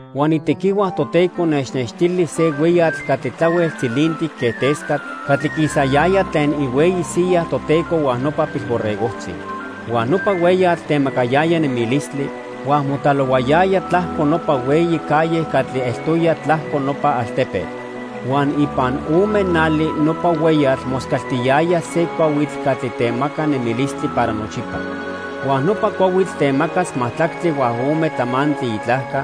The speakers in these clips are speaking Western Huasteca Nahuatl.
Huan itequihua Toteco nechnextili se hueyatl catli tlahuel tzilintic quen tescatl catli quisayaya tlen ihueyi siya Toteco huan nopa Pilborregojtzi. Huan nopa hueyatl temacayaya nemilistli, huan motlalohuayaya tlajco nopa hueyi calle catli eltoya tlajco nopa altepetl. Huan ipan ome nali nopa hueyatl moscaltiyaya se cuahuitl catli temaca nemilistli para nochipa. Huan nopa cuahuitl temacas majtlactli huan ome tlamantli itlajca,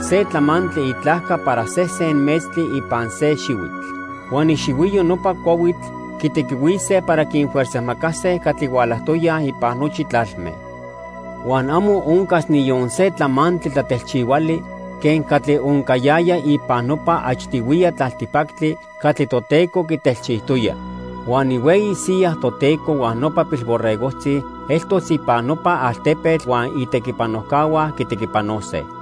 se tlamantli itlajca para sesen metztli ipan se xihuitl. Huan ixihuiyo nopa cuahuitl quitequihuise para quinfuerzajmacase catli hualajtoyaj ipan nochi tlalme. Huan amo oncas niyon se tlamantli tlatelchihuali quen catli oncayaya ipan nopa achtihuiya tlaltipactli catli Toteco quitelchijtoya. Huan ihueyi siya Toteco huan nopa Pilborregojtzi eltos ipan nopa altepetl huan itequipanojcahua quitequipanose.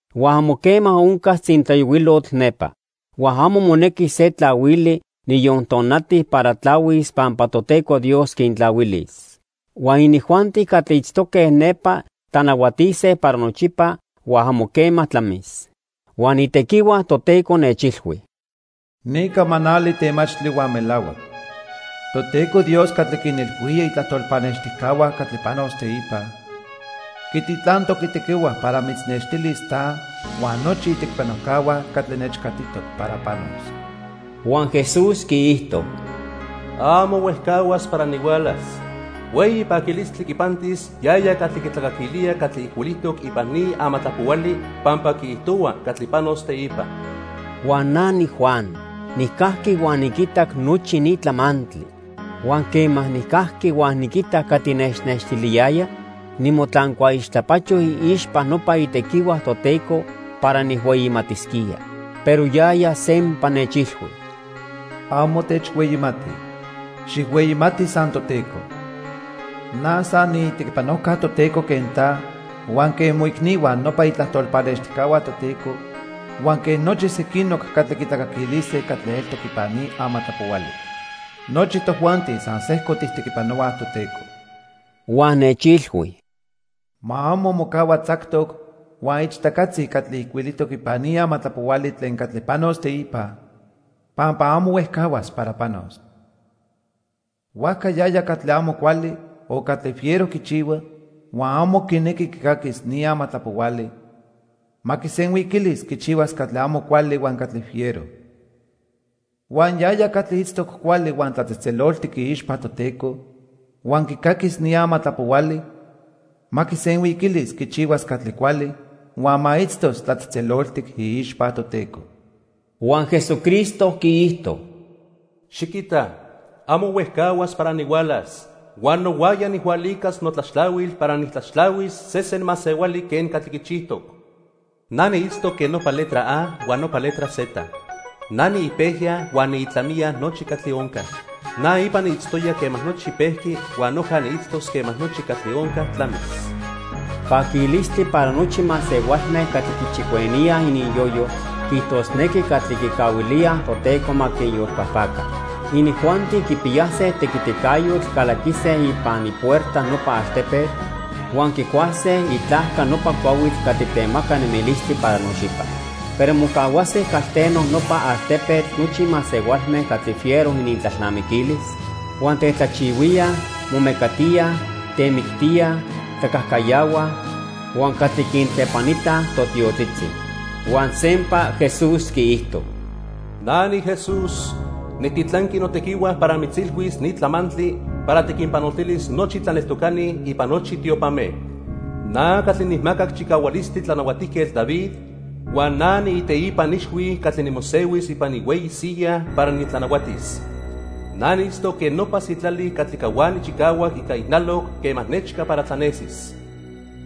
Huan amo quema oncas tzintlayohuilotl nepa. Huan amo monequis se tlahuili, niyon tonati para tlahuis pampa Toteco Dios quintlahuilis. Huan inijuanti catli itztoque nepa tlanahuatise para nochipa huan amo quema tlamis. Huan itequihua Toteco nechilhui: "Ni camanali temachtli huan melahuac. Toteco Dios catli quinilhuía itlajtol pannextijcahua catli panos teipa, quititlantoc itequihua para mitznextilis ta huan nochi itequipanojcahua catli nechcatitoc para panos." Huan Jesús quiijto: "Amo huejcahuas para nihualas. Hueyi paquilistli quipantis yaya catli quitlacaquilía catli ijcuilijtoc ipan ni amatlapohuali pampa quiijtohua catli panos teipa." Huan na niJuan nijcajqui huan niquitac nochi ni tlamantli. Huan quema nijcajqui huan niquitac catli nechnextiliyaya, nimotlancuaixtlapacho iixpa nopa itequihua Toteco para nijhueyimatisquía. Pero yaya sempa nechilhui: "Amo techhueyimati. Xijhueyimati san Toteco. Na san niitequipanojca Toteco quen ta, huan quen moicnihua, nopa itlajtol pannextijcahua Toteco, huan quen nochi sequinoc catli quitlacaquilise catli eltoc ipan ni amatlapohuali. Nochi tojuanti san sejco tijtequipanohuaj Toteco." Huan nechilhui: "Ma amo mocahua tzactoc huan ichtacatzi catli ijcuilijtoc ipan ni amatlapohuali tlen catli panos teipa pampa amo huejcahuas para panos. Huajca yaya catli amo cuali o catli fiero quichihua, huan amo quinequi quicaquis ni amatlapohuali, ma quisenhuiquilis quichihuas catli amo cuali huan catli fiero. Huan yaya catli itztoc cuali huan tlatzejtzeloltic iixpa Toteco huan quicaquis ni amatlapohuali, ma quisenhuiquilis quichihuas catli cuali huan ma itztos tlatzejtzeloltic iixpa Toteco." Huan Jesucristo quiijto: "Xiquita amo huejcahuas para nihualas huan nohuaya nijhualicas notlaxtlahuil para nijtlaxtlahuis sesen masehuali quen catli quichijtoc. Na niitztoc quen nopa letra A huan nopa letra Z. Na niipejya huan niitlamiya nochi catli onca. Na ipa niitztoya quema nochi pejqui huan noja niitztos quema nochi catli onca tlamis." Paquilistli para nochi masehualme catli quichicueníaj ininyoyo, quiijtosnequi, catli quicahuilía Toteco ma quinyolpajpaca. Inijuanti quipiyase tequiticayotl calaquise ipan ipuerta nopa altepetl huan quicuase itlajca nopa cuahuitl catli temaca nemilistli para nochipa. Pero mocahuase calteno nopa altepetl nochi masehualme catli fiero inintlalnamiquilis, huan tetlajchihuíaj, momecatíaj, temictíaj, tlacajcayahuaj huan catli quintlepanitaj totiotzitzi. Huan sempa Jesús quiijto: "Na niJesús, nijtitlanqui notequihua para mitzilhuis ni tlamantli para tiquinpanoltilis nochi tlaneltocani ipan nochi tiopame. Na catli nijmacac chicahualistli Tlanahuatijquetl David huan na niiteipan ixhui catli nimosehuis ipan ihueyi siya para nitlanahuatis. Na niitztoc quen nopa sitlali catli cahuani chicahuac ica ijnaloc quema nechca para tlanesis."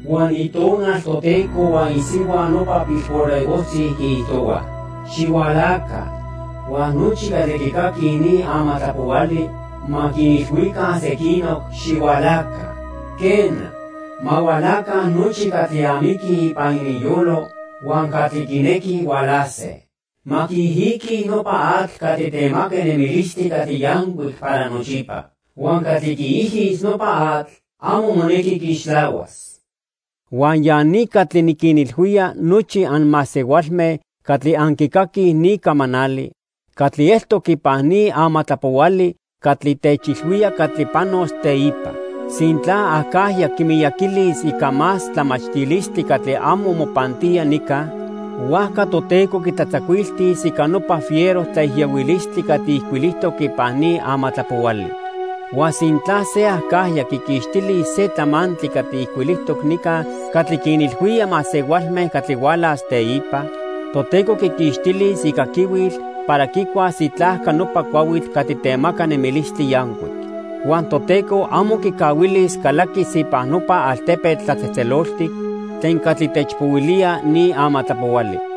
Huan Itonal Toteco huan isihua nopa Pilborregojtzi quiijtohuaj: "Xihualaca." Huan nochi catli quicaquij ni amatlapohuali ma quinilhuica sequinoc: "Xihualaca." Quena, ma hualaca nochi catli amiquij ipan ininyolo huan catli quinequij hualase. Ma quiijiquij nopa atl catli temaca nemilistli catli yancuic para nochipa. Huan catli quiijis nopa atl amo monequi quiixtlahuas. Huan ya ni catli niquinilhuía nochi anmasehualme catli anquicaquij ni camanali catli eltoc ipan ni amatlapohuali catli techilhuía catli panos teipa. Sintla acajya quimiyaquilis ica más tlamachtilistli catli amo mopantía nica, huajca Toteco quitlatzacuiltis ica nopa fiero tlaijiyohuilistli catli ijcuilijtoc ipan ni amatlapohuali. Huan sintla se acajya quiquixtilis se tlamantli catli ijcuilijtoc nica catli quinilhuía masehualme catli hualas teipa, Toteco quiquixtilis icaquihuil para quicuas itlajca nopa cuahuitl catli temaca nemilistli yancuic. Huan Toteco amo quicahuilis calaquis ipan nopa altepetl tlatzejtzeloltic tlen catli techpohuilía ni amatlapohuali.